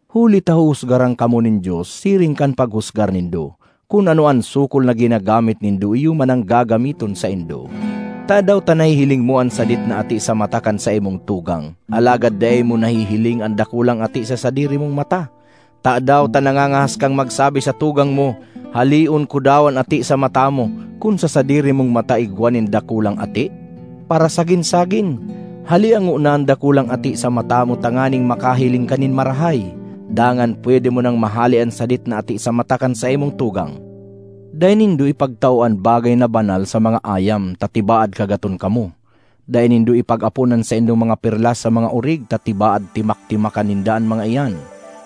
Huli ta huhusgaran kamo nin Dios siring kan paghusgar nindo; kun ano an sukol na ginagamit nindo, iyo man an gagamiton saindo. Tadaw ta nahihiling mo an sadit na ati sa mata kan saimong tugang, alagad dai mo nahihiling an dakulang ati sa sadiri mong mata? Tadaw ta nangangahas kang magsabi sa tugang mo, ‘Haleon ko daw an ati sa mata mo,’ kun sa sadiri mong mata igwa nin dakulang ati? Parasagin-sagin! Halea ngona an dakulang ati sa mata mo tanganing makahiling ka nin marahay; dangan pwede mo nang mahale an sadit na ati sa mata kan saimong tugang. ”Dai nindo ipagtao an bagay na banal sa mga ayam ta tibaad kagaton kamo; dai nindo ipag-apon an saindong mga perlas sa mga orig ta tibaad timak-timakan ninda an mga iyan.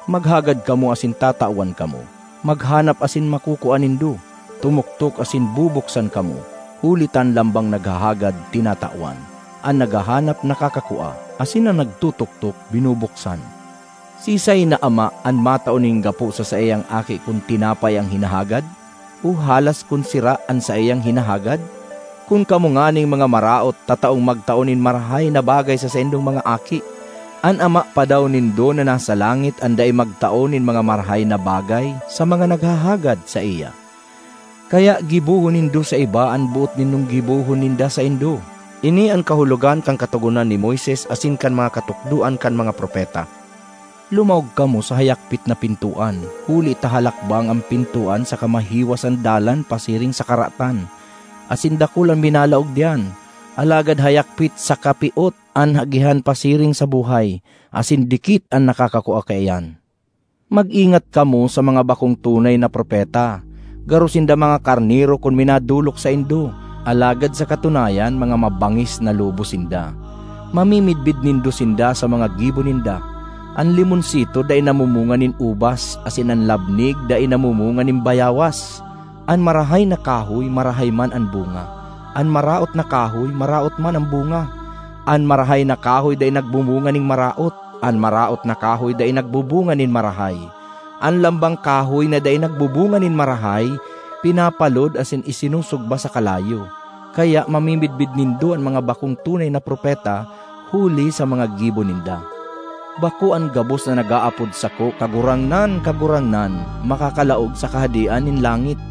”Maghagad kamo asin tatawan kamo; maghanap asin makukua nindo; tumuktok asin bubuksan kamo. Huli ta an lambang naghahagad, tinatawan; an naghahanap, nakakakua; asin an nagtutuktok, binubuksan. Siisay na ama an matao nin gapo sa saiyang aki kun tinapay an hinahagad? O halas kun sira an saiyang hinahagad? Kun kamo nganing mga maraot, tataong magtao nin marahay na bagay sa saindong mga aki, an Ama pa daw nindo na nasa langit an dai magtao nin mga marahay na bagay sa mga naghahagad saiya! ”Kaya gibohon nindo sa iba an boot nindong gibohon ninda saindo. Ini an kahulogan kan Katogonan ni Moises asin kan mga katukdoan kan mga propeta. ”Lumaog kamo sa hayakpit na pintoan, huli ta halakbang an pintoan saka mahiwas an dalan pasiring sa karatan, asin dakul an minalaog diyan. Alagad hayakpit saka piot an agihan pasiring sa buhay. Asin dikit an nakakakua kaiyan. ”Mag-ingat kamo sa mga bakong tunay na propeta; garo sinda mga karnero kun minadolok saindo, alagad sa katunayan mga mabangis na lobo sinda. Mamimidbid nindo sinda sa mga gibo ninda. An limonsito dai namumunga nin ubas asin an labnig dai namumunga nin bayawas. An marahay na kahoy, marahay man an bunga; an maraot na kahoy, maraot man an bunga. An marahay na kahoy dai nagbubunga nin maraot; an maraot na kahoy dai nagbubunga nin marahay. An lambang kahoy na dai nagbubunga nin marahay, pinapalod asin isinusugba sa kalayo. Kaya mamimidbid nindo an mga bakong tunay na propeta huli sa mga gibo ninda. ”Bako an gabos na nag-aapod sako, ‘Kagurangnan, Kagurangnan,’ makakalaog sa Kahadean nin langit,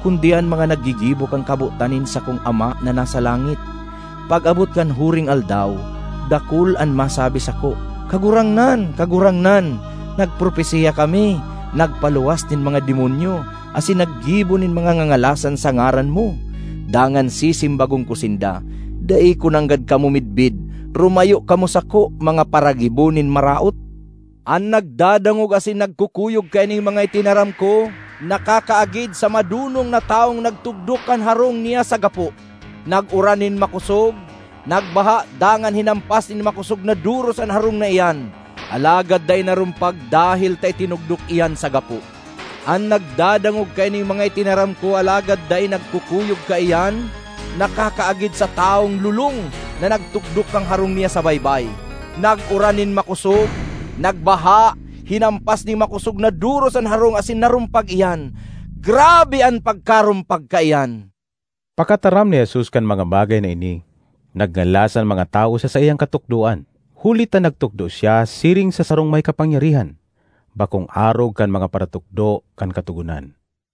kundi an mga naggigibo kan kabotan nin sakong Ama na nasa langit. Pag-abot kan Huring Aldaw, dakul an masabi sako, ‘Kagurangnan, Kagurangnan, nagpropesiya kami, nagpaluwas nin mga demonyo, asin naggibo nin mga ngangalasan sa ngaran mo!’ Dangan sisimbagon ko sinda, ‘Dai ko nanggad kamo midbid. Rumayo kamo sako, mga paragibo nin maraot!’ ”An nagdadangog asin nagkukuyog kaining mga itinaram ko nakakaagid sa madonong na tawong nagtugdok kan harong niya sa gapo. Nag-uran nin makosog, nagbaha dangan hinampas nin makosog na doros an harong na iyan, alagad dai narumpag dahel ta itinugdok iyan sa gapo. An nagdadangog kaining mga itinaram ko alagad dai nagkukuyog kaiyan, nakakaagid sa tawong lolong na nagtugdok kan harong niya sa baybay. Nag-uran nin makosog, nagbaha, hinampas nin makosog na doros an harong asin narumpag iyan. Grabe an pagkarumpag kaiyan!” Pakataram ni Jesus kan mga bagay na ini, nagngalas an mga tawo sa saiyang katukdoan, huli ta nagtukdo siya siring sa sarong may kapangyarihan, bakong arog kan mga paratukdo kan Katogonan.